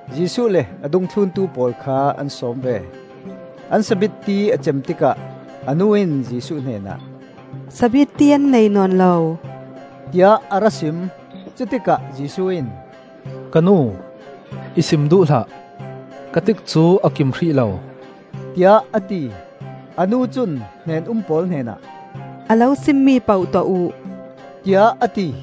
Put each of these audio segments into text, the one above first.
Jesuh le a dungthluntu pawl kha an sawm ve. An sabitti a cem tikah a nu in Jesuh hnenah, öSabitti an nei nawn lo,” tiah a ra sim. Cutikah Jesuh in, öKa nu, i sim duh hlah; ka tikcu a kim hrih lo,” tiah a ti. A nu cun hnen-um pawl hnenah, öA lo simmi poh tuah uh,” tiah a ti.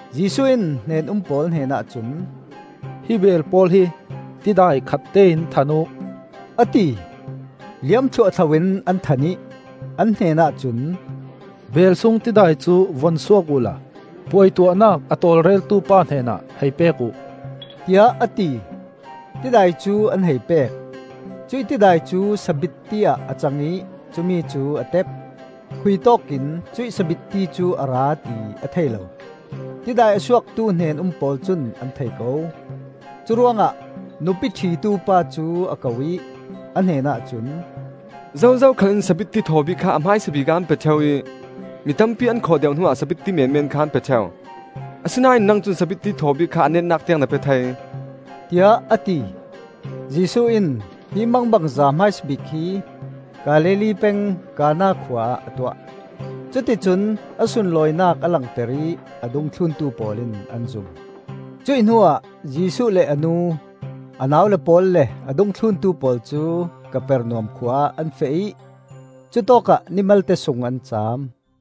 Jesuh in hnen-um pawl hnenah cun, öHi beel pawl hi tidai khat tein than uh,” a ti. Liam thluahthlo in an than ih, an hnenah cun, öBeel sung tidai cu vun suak uhla puaituahnak a tawlreltu pa hnenah hei pek uh,” tiah a ti. Tidai cu an hei pek. Cuih tidai cu sabitti ah a cang ih cumi cu a tep. Khuitawkin cuih sabitti cu a ra ti a thei lo; tidai a suaktu hnen-um pawl cun an thei ko. Curuangah nupi òhitu pa cu a ko ih, a hnenah cun, öZozo khal in sabitti thaw bik kha a hmaisabik ah an pe òheu ih mi tampi an khawh deuh hnuah sabitti menmen kha an pe òheu; asinain nang cun sabitti thaw bik kha a netnak tiang na pe thei,” tiah a ti. Jesuh in hi mangbangza hmaisa bik hi Galilee peng Kana khua ah a tuah. Cuticun a sunlawinak a langter ih a dungthluntu pawl in an zum. Cuih hnuah Jesuh le a nu, a naule pawl le a dungthluntu pawl cu Kapernaum khua ah an feh ih cutawkah ni malte sung an cam.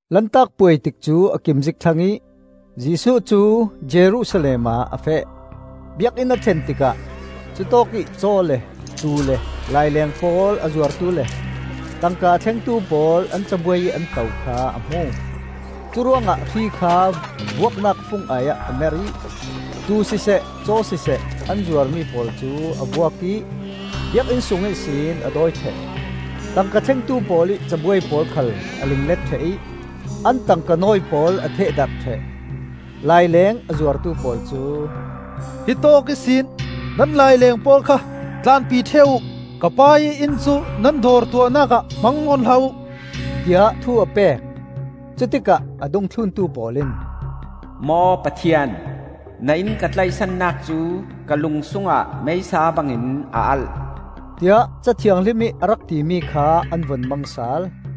Lantak Puai tikcu a kim zik thlang ih Jesuh cu Jerusalem ah a feh. Biakinn a thlen tikah cutawkih caw le tuu le laileng pawl a zuartu le tangka a thlengtu pawl an cabuai ih an to kha a hmu. Curuangah hri kha vuaknak fung ai-ah a merh ih, tuu siseh caw siseh an zuarmi pawl cu a vuak ih Biakinn sung ihsin a dawi òheh; tangka thlengtu pawl ih cabuai pawl khal a linglet òheh ih an tangkanawi pawl a thehdarh òheh. Laileng a zuartu pawl cu, öHitawk ihsin nan laileng pawl kha tlanpi òheh uh! Ka Pa ih inn cu nan dawr tuahnak ah hmang nawn hlah uh!” tiah thu a pek. Cutikah a dungthluntu pawl in, öMaw Pathian, na inn ka tlaihsannak cu ka lung sungah meisa bangin a alh,” tiah Ca Thianghlim ih a rak timi kha an vun mang sal.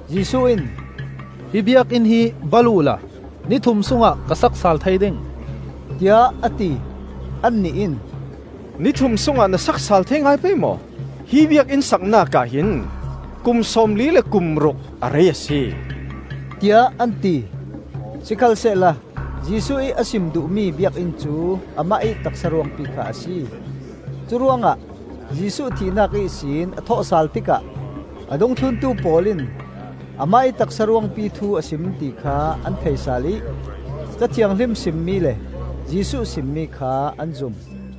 Jesuh in, öHi Biakinn hi bal uhla ni thum sungah ka sak sal thei ding,” tiah a ti. Annih in, öNi thum sungah na sak sal thei ngai pei maw? Hi Biakinn saknak ah hin kum sawm li le kum ruk a rei a si,” tiah an ti. Sikhalsehla Jesuh ih a sim duhmi Biakinn cu amah ih taksa ruangpi kha a si. Curuangah Jesuh thihnak ihsin a thawhsal tikah a dungthluntu pawl in amah ih taksa ruangpi thu a sim ti kha an thei sal ih Ca Thianghlim simmi le Jesuh simmi kha an zum.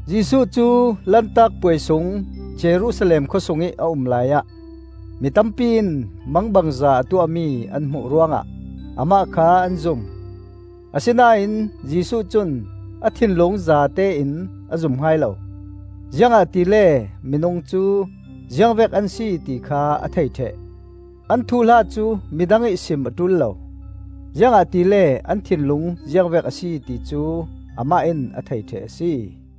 Jesuh cu Lantak Puai sung Jerusalem khawsungih a um laiah mi tampi in mangbangza a tuahmi an hmuh ruangah amah kha an zum. Asinain Jesuh cun a thinlung zatein a zum hai lo, ziangahtile minung cu ziangvek an si ti kha a thei òheh. An thuhla cu midang ih sim a òul lo, ziangahtile an thinlung ziangvek a si ti cu amah in a thei òheh a si.